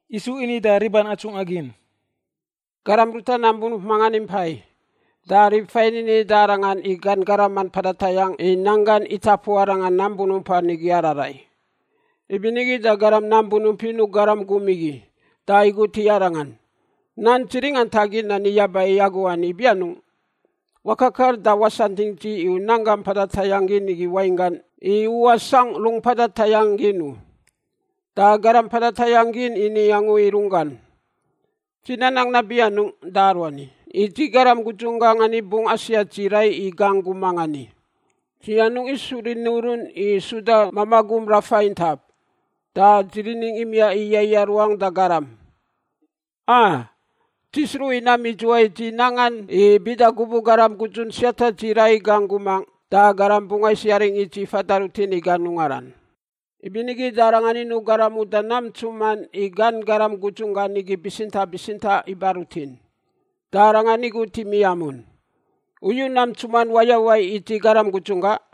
Yisu ini da riban atsungꞌa gin, “Garam ruta nam bunump mangan impai, da rib fain ini da arangan i gan garaman mpada tayangꞌ i nanggan itapu arangan nam bunumpan igi ararai. Ibinigi da garam nam bunump inuꞌ garam gum igi da igut i arangan, ‘Nan dzi ringantagin yaba i agu ani ibi anungꞌ? Wakakar da wasantingꞌ dzi i u nanggam mpada tayangꞌ gin wainggan, i u wasangꞌ rung mpada tayangꞌ gin u.’ “Da garam mpada tayangꞌ igi ini angu i runggan, ‘Dzi nanang nabi anungꞌ da aruani? I dzi garam gudzunggaꞌ ani bungꞌ asiat dzi rai i gangꞌ gumangꞌ ani. Dzi anungꞌ isu rini urun i suda mamaꞌ gum rafa intap, da dzi riningꞌ imiaꞌ i yaiꞌa ruangꞌ da garam. A! Dzi sruꞌ i nam idzuwai dzi nangan i bida gubuꞌ garam gudzun siata dzi rai i gangꞌ gumangꞌ da garam bungꞌ ais yaring i dzi fada rutin i gan ungaran.’ “Ibinigi da arangan inuꞌ garam uda nam ntsuman i gan garam gudzun gan igi bitsintaꞌ bitsintaꞌ iba rutin. Da arangan igut i miamun, ‘U yu nam ntsuman wayawai i dzi garam gudzunggaꞌ?’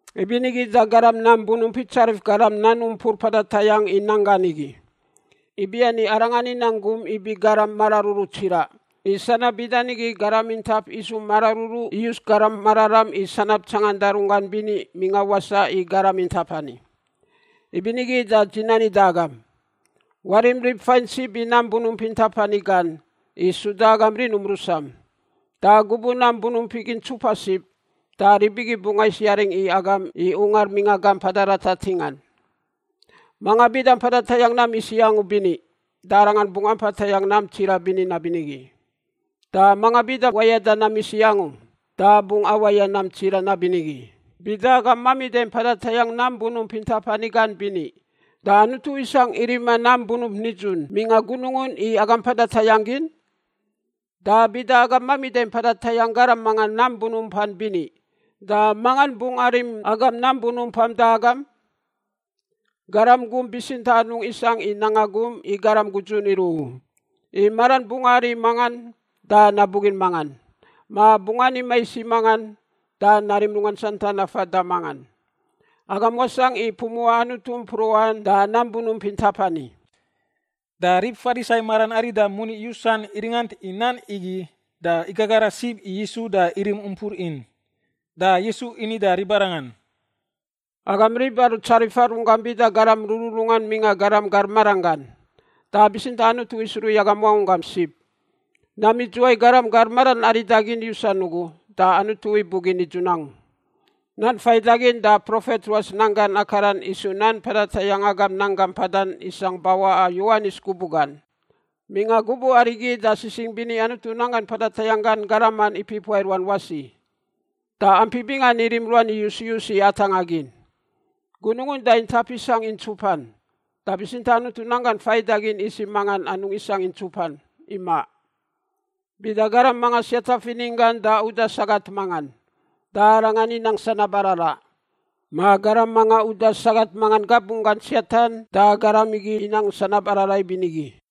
“Ibinigi da garam nam bunump itsarif garam nan umpur mpada tayangꞌ i nanggan igi, ibiani arangan inang gum ibi garam mararuru tsiraꞌ. I sanab bida nigi garam intap isu mararuru iyus garam mararam i sanab tsanganda runggan bini mingꞌa wasaꞌ i garam intap ani. Ibinigi da dzi nani da agam, warim rib fain sib i nam bunump intap ani gan i suda agam rinum rusam. Da gubuꞌ nam bunump igi ntsupa sib da rib igi bungꞌ ais yaring i agam i ungar mingꞌa gamp mpada ratar ntingan. “Manga bida mpada tayangꞌ nam isiꞌ angu bini, da arangan bungꞌ ampa tayangꞌ nam tsiraꞌ bini nabinigi. Da mangan bida wayada nam isiꞌ angu da bungꞌ awaya nam tsiraꞌ nabinigi. Bida agam mamida mpada tayangꞌ nam bunump intap ani gan bini, da Anutu isangꞌ i rima nam bunump nidzun mingꞌa gunungun i agam mpada tayangꞌ gin? Da bida agam mamida mpada tayangꞌ garam mangan nam bunumpan bini, da mangan bungꞌ arim agam nam bunumpam da agam? “Garam gum bitsintaꞌ anungꞌ isangꞌ i nanga gum i garam gudzun iruꞌ u, i maran bungꞌ ari i mangan da nabugin mangan, ma bungꞌ ani mais i mangan da narim runggan santan nafa da mangan. Agam wasangꞌ i pumuꞌa Anutu mpruꞌan da nam bunump intap ani.” Da rib Farisai maran arida i moni yusan iringant i nan igi da igagara sib i Yisu da irim umpur in. Da Yisu ini da ribarangan, “Agam rib aru tsarifa runggam bida garam rururungan mingꞌa garam gar maranggan, da bitsintaꞌ Anutu isruꞌ i agam wangunggam sib. Nam idzuwai garam gar maran arida gin yusan ugu da Anutu ibugin nidzun angu. Nan faidagin da profet ruas nan gan akaran isu nan mpada tayangꞌ agam nanggam mpadan isangꞌ bawaꞌa Yowanis gubuꞌ gan. Mingꞌa gubuꞌ arigi da sisingꞌ bini Anutu nanggan mpada tayangꞌ gan garaman ipipuaꞌ i ruan wasi, da ampi bingan irim ruan iyus iyus i atangꞌa gin. Gunungun da intap isangꞌ i ntsupan, da bitsintaꞌ Anutu nan gan faidagin isiꞌ mangan anungꞌ isangꞌ i ntsupan. Imaꞌ. Bida garam mangan siata fininggan da uda sagat mangan da arangan inang sanab araraꞌ, ma garam manga uda sagat mangan gabunggan siatan da garam igi inang sanab araraꞌ ibinigi.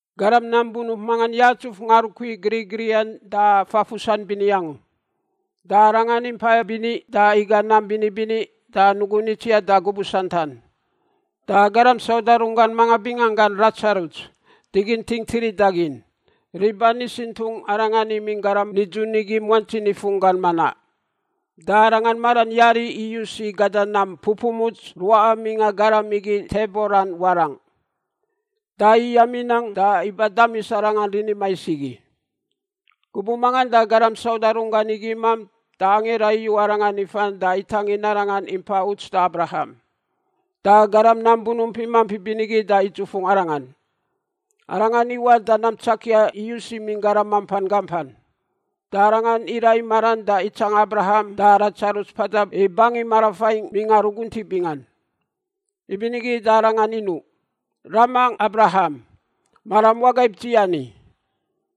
“Garam nam bunump mangan yatsuf ngarukui grigriꞌan da fafusan bini angu. Da arangan impa bini da iga nam bini bini da nugun itsiaꞌ da gubuꞌ santan. Da garam sauda runggan mangan binganggan Ladzarus, diginting tirida gin, riban isintungꞌ arangan imingꞌ garam nidzun igi muantsi nifun gan manaꞌ. Da arangan maran yari iyus i gada nam pupumuts ruꞌa mingꞌa garam igi tebolan warangꞌ. Da iyam inang da iba damis arangan rini mais igi. “Gubuꞌ mangan da garam sauda runggan igi imamp da angira iyu arangan ifan da itangin arangan impa uts da Abraham. Da garam nam bunump imamp ibinigi da idzufungꞌ arangan. Arangan iwaꞌ da nam tsakia iyus imingꞌ garam mampan gampan, da arangan iraꞌ i maran da itsanga Abraham da Ladzarus mpada i bangin marafaingꞌ mingꞌa ruguntiꞌ bingan. “Ibinigi da arangan inuꞌ, ‘Ramangꞌ Abraham, maram wagaib dzi ani.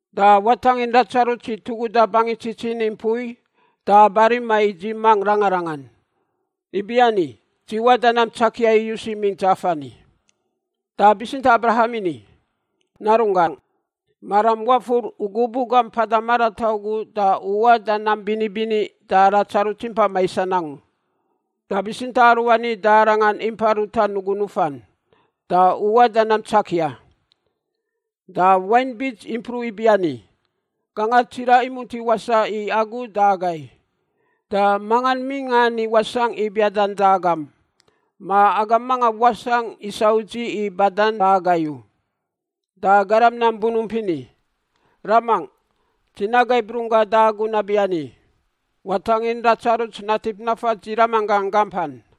Da watangin Ladzarus i tuguda bangin tsitsin i mpui da ba rima i dzi mangꞌ rangarangan, ibiani dzi waꞌ da nam tsakia iyus imingꞌ dzaf ani.’ “Da bitsintaꞌ Abraham ini, ‘Narunggangꞌ, maram wafur u gubuꞌ gam mpada marataꞌ ugu da u waꞌ da nam bini bini da Ladzarus impa maisan angu, da bitsintaꞌ aruani da arangan impa ruta nugun nufan, da u waꞌ da nam tsakia. Da wain bits impruꞌ ibiani, gangar tsiraꞌ imunti wasaꞌ i agu da agai, da mangan mingꞌa ani wasangꞌ i biadan da agam, ma agam mangan wasangꞌ isa udziꞌ i badan da agai u.’ “Da garam nam bunump ini, ‘Ramangꞌ, dzi nagaib runggangꞌ da agu nabiani. Watangin Ladzarus natip nafa dzi ramanggaꞌ gampan,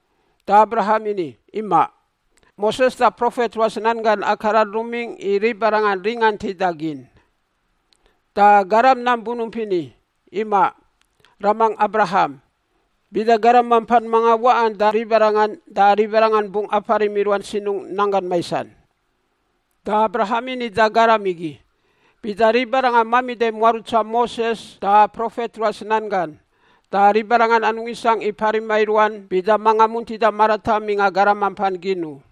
“Da Abraham ini, ‘Imaꞌ. Moses da profet ruas nan gan akaran rumingꞌ i ribarangan ringantida gin.’ “Da garam nam bunump ini, ‘Imaꞌ, ramangꞌ Abraham, bida garam mampan mangan waꞌan da ribarangan da ribarangan bungꞌ aparim i ruan sinungꞌ nanggan maisan.’ “Da Abraham ini da garam igi, ‘Bida ribarangan mamida muarutsa Moses da profet ruas nan gan, da ribarangan anungꞌ isangꞌ i parima i ruan bida manga muntida marataꞌ mingꞌa garam mampan gin u.’”